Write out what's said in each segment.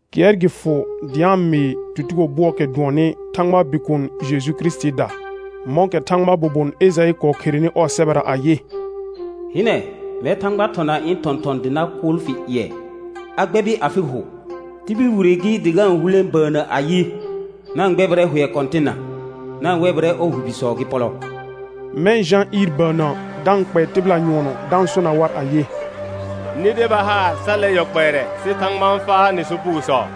Kɩɛr gɩ fʋ dɩ a-n mɩɩ tutugo bʋɔɔkɛ dʋɔnnɩ Thãgbaa Bikuun Jeju Kirisitiida, mɔ̃kɛ Thãgbaa bobon Ejaɩ kɔɔ kherenɩ ɔɔ sɛbɛra ayɩ: «Hɩnɛ, mɛr Thãgba thɔna ɩ̃ thɔ̃thɔ̃, dɩ na kʋʋl fɩ ƴɩɛ, a gbɛbɩ afɩ hʋ. Tibil wire gɩ dɩ ga-n hulẽ bəənnə ayɩ: Na-n gbɛbɩrɛ hʋɛ Kɔ̃tɩnna, na-n wɛbɩrɛ ɔɔ hʋ bisɔ gɩ pɔlɔ.» Mɛ̃ Jã ɩɩr bəənnə da-n kpɛɛ tɩbɩla nyʋɔnɔ da-n sona war ayɩ: Nɩ deba haar sa 'lɛ yɔ kpɛɛrɛ sɩ Thãgba n faa nɩ sopugosɔ.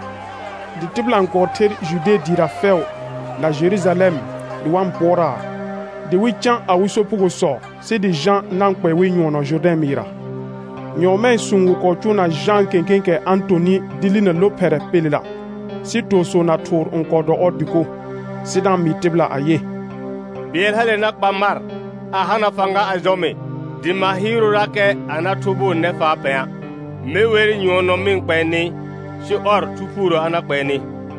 Dɩ tɩbɩla n kɔɔ ther Jude dɩɩra fɛʋ na Jerujalɛm dɩ wa-n pʋɔraa, dɩ wɩ cã awɩ sopugosɔ sɩ dɩ Jã na-n kpɛɛ wɩ nyʋɔnɔ Jʋrdɛ̃ mɩɩrra. Nyɔɔmɛɛ sũu wɩ kɔɔ cʋʋna Jãa kẽkẽekɛ a-n tonɩ dɩ linə lophɛrɛ pelela, sɩ toosõo na thʋʋr n kɔɔ dɔ ɔɔ dɩko. Sɩ da-n mɩɩ tɩbɩla ayɩ: Bɩɛl hale na kpa mar, a hana fãga a jɔ mɩ, dɩ ma hɩɩrʋʋrakɛ a na thʋbʋʋ nɛfaa pɛ̃a'. Me wer nyʋɔnɔ mɩ kpɛɛ nɩ, sɩ ɔr, Thu Phuurə a na kpɛɛ nɩ.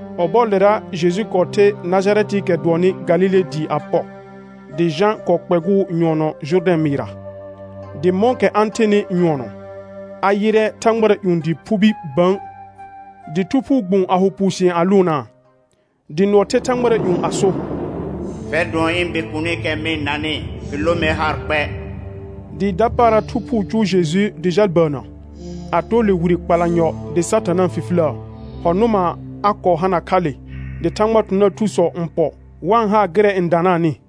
Ɔbɔɔlera Jeju kɔɔ the Najarɛtɩɩkɛ dʋɔnnɩ Galile dɩɩ a pɔ, dɩ Jã kɔɔ kpɛgʋʋ nyʋɔnɔ Jʋrdɛ̃ mɩɩrra. Dɩ mɔ̃kɛ a-n thenɩ nyʋɔnɔ, a yɩrɛ thãgbara ƴũ dɩɩ phubi bə̃, dɩ Thu Phuu gbũ a ho puusɩ̃ɛ a lʋʋnaa. Dɩ nʋɔ the thãgbara ƴũ a so: Fɛr dʋɔn ɩ̃ Bikuunikɛ mɩ-n nanɩ, fɩ lõ mer haar kpɛ. Dɩ dapaara Thu Phuu cʋʋ Jeju dɩ jal bəənnə; a too le wire kpalanyɔ dɩ Satã na-n fifiləə, hɔ̃ nʋma a kɔɔ hana kha le, dɩ Thãgbaa thɔ̃thɔ̃daar thusɔ n pɔ dɩ wa-n haa gɩrɛ n danaanɩ.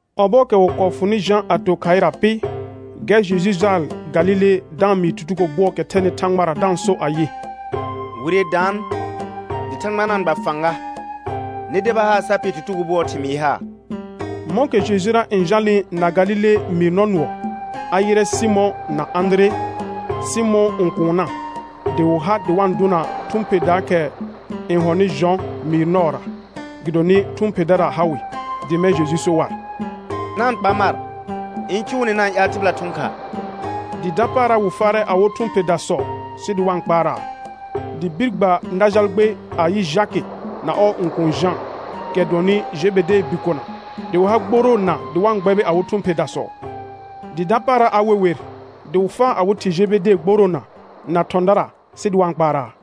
Ɔbɔɔkɛ wɩ kɔɔ fʋnɩ Jã a to khaɩra pɩ, gɛr Jeju jaal Galile da-n mɩɩ tutugo bʋɔɔkɛ thɛnɩ Thãgbara da-n so ayɩ: Wire daan dɩ Thãgba na-n gba fãga. Nɩ deba haar sa pɩɛr tutugo bʋɔɔ thɩmɩɩ haar. Mɔ̃kɛ Jejura n jalnɩ na Galile mɩɩr nɔ nʋɔ, a yɩrɛ Sɩmɔ̃ na Ãdire, Sɩmɔ̃ɔ õkuunna dɩ wɩ ha dɩ wa-n dʋna thʋ̃ pherdaakɛ n hɔnɩ jɔ̃ mɩɩr nɔɔra, gɩdonɩ thʋ̃ pherdara ha wɩ. Dɩ mɛ̃ Jeju so war: Na-n kpa mar ɩ̃ cʋʋ nɩ na-n ƴaal tɩbɩla thʋ̃ khaa. Dɩ dapaara wɩ faarɛ awɩ thʋ̃ pherdasɔ sɩ dɩ wa-n kpaaraa. Dɩ bir gba na jal gbe, a yɩ Jakɩ na ɔɔ õkuun Jã, kɛ dʋɔnnɩ Jebedee bikona, dɩ wɩ ha gboroona dɩ wa n gbɛbɩ awɩ thʋ̃ pherdasɔ. Dɩ dapaara a we wer, dɩ wɩ faa awɩ thɩ Jebede gboroona na thɔ̃dara sɩ dɩ wa-n kpaaraa.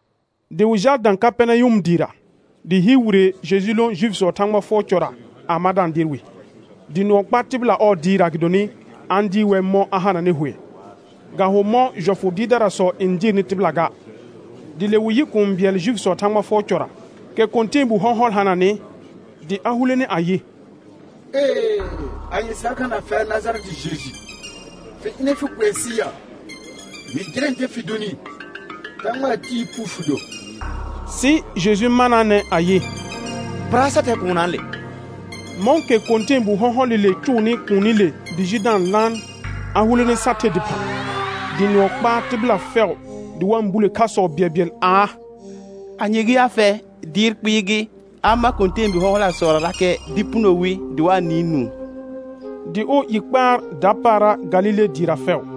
Dɩ wɩ jaal dã Kapɛrnayʋm dɩɩra, dɩ hɩɩr wire Jeju lõ Juifisɔɔ Thãgba fʋɔr cɔra a ma da-n dɩɩr wɩ. Dɩ nʋɔ kpaa tɩbɩla ɔɔ dɩɩrra gɩdonɩ a-n dɩɩr wɛr mɔ̃ a hananɩ hʋɛ, ga ho mɔ̃ jɔfʋ dɩɩrdarasɔ n dɩɩrnɩ tɩbɩla ga. Dɩ le wɩ yɩ kũu bɩɛl Juifisɔɔ Thãgba fʋɔr cɔra, kɛ kɔ̃tɛɛbu hɔ̃hɔl hananɩ, dɩ a hulene ayɩ: Ee, anye sɩ ha kha na fɛr Najarɛtɩ Jeju? Fɩ ɩnɛ fɩ kʋɛ sɩ ya? Mɩ jɩrɛ ntɛ fɩ donɩ: Thãgbaa Tɩɩ phu fɩ do. Sɩ Jeju manaanɛ ayɩ: Pɩra, sa thɛ kuunnaale. Mɔ̃kɛ kɔ̃tɛɛbu hɔ̃hɔlɩle cʋʋnɩ kuunile dɩ ji da-n laan, a hulene sa the dɩphã. Dɩ nʋɔ kɔɔ kpaa tɩbɩla fɛʋ dɩ wa-n bule khasɔ bɩɛlbɩɛl aa: Anye gɩ ya fɛ? Dɩɩr kpɩɩ gɩ; a-n mar kɔ̃tɛɛbi hɔ̃hɔlasɔrarakɛ dɩ puno wi, dɩ wa-n nɩɩ nũu. Dɩ ɔɔ i kpaar dapaara Galile dɩɩra fɛʋ.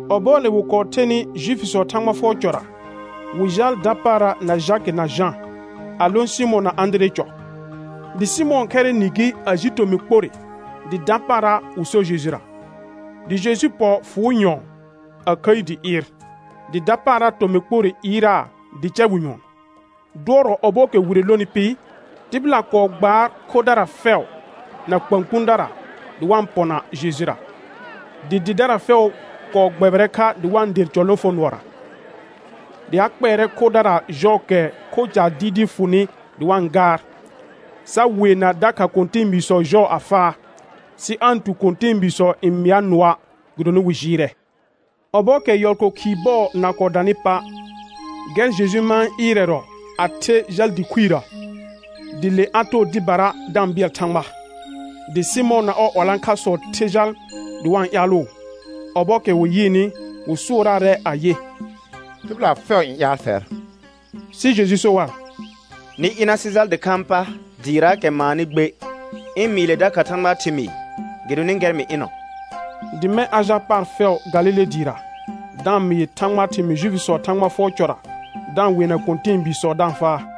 Ɔbɔɔle wɩ kɔɔ thenɩ Juifisɔɔ Thãgba fʋɔr cɔra, wɩ jaal dapaara na Jakɩ na Jã, a lõ Sɩmɔ̃ na Ãdiree cɔ. Dɩ Sɩmɔ̃ɔ khɛrɩ nɩ gɩ, a ji tomɩ kporre, dɩ dapaara wɩ sor Jejura. Dɩ Jeju pɔ fʋʋ nyɔ̃ɔ, a khəi dɩ ɩɩr, dɩ dapaara tomɩ kporre ɩɩraa dɩ cɛ wɩ nyʋɔn. Dʋɔrɔ ɔbɔɔkɛ wire lonɩ pɩ, tɩbɩla kɔɔ gbaar khodara fɛʋ na kpãkpũdara dɩ wa-n pɔna Jejura, dɩ dɩdara fɛʋ kɔɔ gbɛbɩrɛ kha dɩ wa-n der cɔ lõfonʋɔra. Dɩ a kpɛɛrɛ khodara jɔɔkɛ kho caar dɩɩdɩɩ fʋnɩ dɩ wa-n gaar, sa weena dakha kɔ̃tɛɛbiisɔ jɔɔ a faa, sɩ aa-n tu kɔ̃tɛɛbiisɔ n mɩa nʋɔa', gɩdonɩ wɩ jɩɩrɛ. Ɔbɔɔkɛ yɔl ko khɩɩ bɔɔ na kɔɔ danɩ pa', gɛr Jeju mãa ɩrɛrɔ a the jal dɩ khuirə, dɩ le a too dɩbara da n bɩɛl Thãgba. Dɩ Sɩmɔ̃ na ɔɔ 'walãkhasɔ the jal dɩ wa-n ƴaalʋʋ; ɔbɔɔkɛ wɩ yɩɩnɩ wɩ sʋʋraarɛ ayɩ: Tɩbɩla fɛʋ n ƴaal fɛr. Sɩ Jeju so war: Nɩ ɩna sɩ jal dɩkhãa pa dɩɩraakɛ maanɩ gbe, ɩ̃ mɩɩ le dakha Thãgbaa thɩmɩɩ, gɩdonɩ gɛr mɩ ɩnɔ. Dɩ mɛ̃ a jal paar fɛʋ Galile dɩɩra, da-n mɩɩ Thãgbaa thɩmɩɩ Juifisɔɔ Thãgba fʋɔr cɔra, da-n weena kɔ̃tɛɛbiisɔ da-n faa.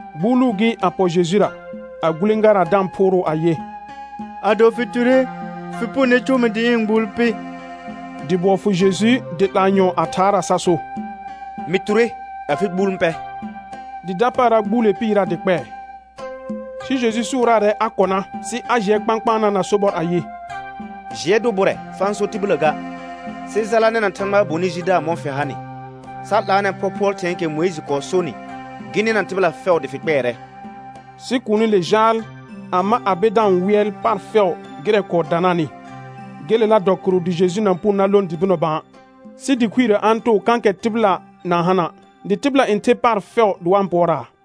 Gbuuluu gɩ, a pɔ Jejura, a gulẽgaraa da-n phʋʋrʋʋ ayɩ: Ado fɩ ture fɩ punone cʋʋ mɩ dɩ ɩ̃ gbuul pɩ. Dɩ bʋɔ fʋ Jeju dɩ 'laa nyɔ̃ɔ a thaaraa sa so: Mɩ ture afɩ gbuul n pɛ. Dɩ dapaara gbuule pɩɩraa dɩ kpɛɛ. Sɩ Jeju sʋʋraarɛ a kɔna sɩ a jɩɛ kpãkpaanaa na sobɔr ayɩ: Jɩɛ dʋ bʋrɛ fa-n so tibillə ga, sɩ jala nɛna Thãgbaa bonɩ jidaar mɔ̃ fɩ hanɩ, sa 'laanɛ phɔphʋɔl thɩ̃ɛɛkɛ Mʋɩjɩ kɔɔ sonɩ, gɩ nɩna tɩbɩla fɛʋ dɩ fɩ kpɛɛrɛ. Sɩ kuunile jaal, a ma a be da-n wɩɛl paar fɛʋ gɩrɛ kɔɔ danaanɩ; gelela dɔ kɩrʋ dɩ Jeju na-n puno dɩ lõ dɩ bɩnɔ bã; sɩ dɩ khuirə a-n too kãkɛ tɩbɩla na-n hana', dɩ tɩbɩla n ther paar fɛʋ dɩ wa-n pʋɔraa.